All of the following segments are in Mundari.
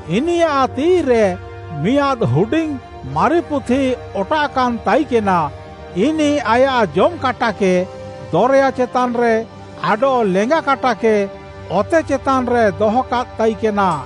ଇନିୟାଃ ତିଃଇରେ ମିଆଁଦ୍‌ ହୁଡିଙ୍ଗ୍‌ ମାରି ପୁଥି ଅଟାଃକାନ୍‌ ତାଇକେନା। ଇନିଃ ଆୟାଃ ଜମ୍‍ କାଟାକେ ଦରେୟା ଚେତାନ୍‌ରେ ଆଡଃ ଲେଙ୍ଗା କାଟାକେ ଅତେ ଚେତାନ୍‌ରେ ଦହକାଦ୍‌ ତାଇକେନା।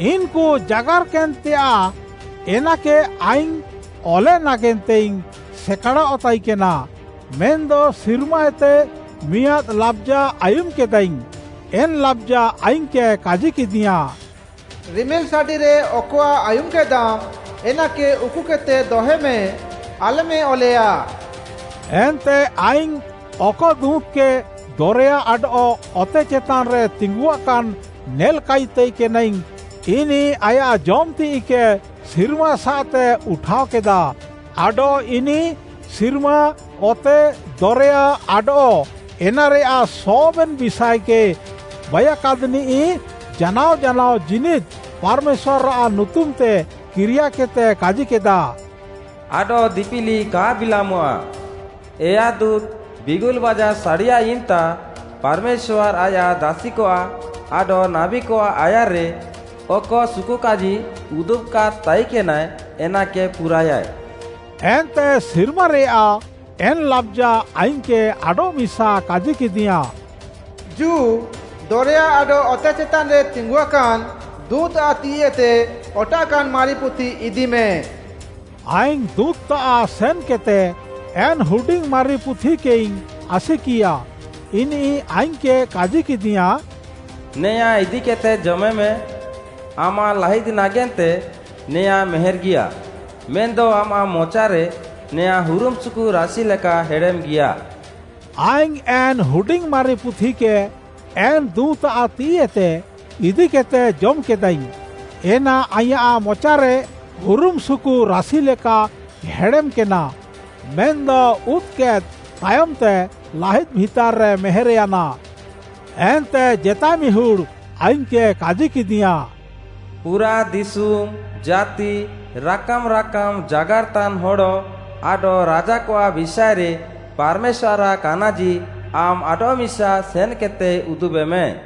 ଇନ୍‌କୁ ଜାଗାର୍‌କେନ୍‌ତେୟାଃ, ଏନାକେ ଆଇଙ୍ଗ୍‌ ଅଲେ ନାଗେନ୍ତେଇଙ୍ଗ୍‌ ସେକାଡ଼ଃ ତାଇକେନା, ମେନ୍‌ଦ ସିର୍ମାଏତେ ମିଆଁଦ୍‌ ଲାବ୍‌ଜା ଆୟୁମ୍‌କେଦାଇଙ୍ଗ୍‌। ଏନ୍‌ ଲାବ୍‌ଜା ଆଇଙ୍ଗ୍‌କେ କାଜିକେଦିୟାଁ, “ରିମିଲ୍‌ସାଡ଼ିରେ ଅକଆଃ ଆୟୁମ୍‌କେଦାମ୍‌, ଏନାକେ ଉକୁକେଦ୍‌ତେ ଦହେମେ, ଆଲ୍‌ମେ ଅଲେୟା।” ଏନ୍ତେ ଆଇଙ୍ଗ୍‌ ଅକ ଦୁଁତ୍‌କେ ଦରେୟା ଆଡଃ ଅତେ ଚେତାନ୍‌ରେ ତିଙ୍ଗୁଆକାନ୍‌ ନେଲ୍‍କାଇ ତାଇକେନାଇଙ୍ଗ୍‌, ଇନିଃ ଆୟାଃ ଜମ୍‌ ତିଃଇକେ ସିର୍ମାସାଃତେ ଉଠାଅକେଦା, ଆଡଃ ଇନିଃ ସିର୍ମା, ଅତେ, ଦରେୟା, ଆଡଃ ଏନାରେୟାଃ ସବେନ୍‌ ବିଷାଏକେ ବାଇୟାକାଦ୍‌ନିଃ ଜାନାଅ ଜାନାଅ ଜୀନିଦ୍‌ ପାର୍‌ମେଶ୍ୱାର୍‌ଆଃ ନୁତୁମ୍‌ତେ କିରିୟାକେଦ୍‌ତେ କାଜିକେଦା, “ଆଡଃ ଦିପିଲି କା ବିଲାମଃଆ! ଏୟା ଦୁଁତ୍‌ ବିଙ୍ଗୁଲ୍‌ବାଜା ସାଡ଼ିୟାଏ ଇମ୍‌ତା, ପାର୍‌ମେଶ୍ୱାର୍‌ ଆୟାଃ ଦାସିକଆଃ ଆଡଃ ନାବୀକଆଃ ଆୟାର୍‌ରେ, ଅକ ସୁକୁକାଜି ଉଦୁବ୍‌କାଦ୍‌ ତାଇକେନାଏ, ଏନାକେ ପୁରାଏୟାଏ।” ଏନ୍ତେ ସିର୍ମାରେୟାଃ ଏନ୍‌ ଲାବ୍‌ଜା ଆଇଙ୍ଗ୍‌କେ ଆଡଃମିସା କାଜିକେଦିୟାଁ, “ଜୁ, ଦରେୟା ଆଡଃ ଅତେ ଚେତାନ୍‌ରେ ତିଙ୍ଗୁଆକାନ୍‌ ଦୁଁତ୍‌ଆଃ ତିଃଇଏତେ ଅଟାଃକାନ୍‌ ମାରି ପୁଥି ଇଦିମେ।” ଆଇଙ୍ଗ୍‌ ଦୁଁତ୍‌ତାଃ ସେନ୍‌କେଦ୍‌ତେ ଏନ୍‌ ହୁଡିଙ୍ଗ୍‌ ମାରି ପୁଥିକେଇଙ୍ଗ୍‌ ଆସିକିୟା। ଇନିଃ ଆଇଙ୍ଗ୍‌କେ କାଜିକେଦିୟାଁ, “ନେଆଁ ଇଦିକେଦ୍‌ତେ ଜମେମେ। ଆମାଃ ଲାହିଦ୍‌ ନାଗେନ୍ତେ ନେଆଁ ମେହେର୍‌ଗିୟା, ମେନ୍‌ଦ ଆମାଃ ମଚାରେ ନେଆଁ ହୁରୁମ୍‌ସୁକୁ ରାସି ଲେକା ହେଡ଼େମ୍‌ଗିୟା।” ଆଇଙ୍ଗ୍‌ ଏନ୍‌ ହୁଡିଙ୍ଗ୍‌ ମାରି ପୁଥିକେ, ଏନ୍‌ ଦୁଁତ୍‌ଆଃ ତିଃଇଏତେ ଇଦିକେଦ୍‌ତେ ଜମ୍‌କେଦାଇଙ୍ଗ୍‌। ଏନା ଆଇଁୟାଃ ମଚାରେ ହୁରୁମ୍‌ସୁକୁ ରାସି ଲେକା ହେଡ଼େମ୍‌କେନା, ମେନ୍‌ଦ ଉଦ୍‌କେଦ୍‌ ତାୟମ୍‌ତେ ଲାହିଦ୍‌ ଭିତାର୍‌ରେ ମେହେର୍‌ୟାନା। ଏନ୍ତେ ଜେତାଏ ମିହୁଡ଼୍‌ ଆଇଙ୍ଗ୍‌କେ କାଜିକେଦିୟାଁ, “ପୁରାଃ ଦିଶୁମ୍‌, ଜାତି, ରାକାମ୍‌ ରାକାମ୍‌ ଜାଗାର୍‌ତାନ୍‌ ହଡ଼ ଆଡଃ ରାଜାକଆଃ ବିଷାଏରେ ପାର୍‌ମେଶ୍ୱାର୍‌ଆଃ କାନାଜି, ଆମ୍‌ ଆଡଃମିସା ସେନ୍‌କେଦ୍‌ତେ ଉଦୁବେମେ।”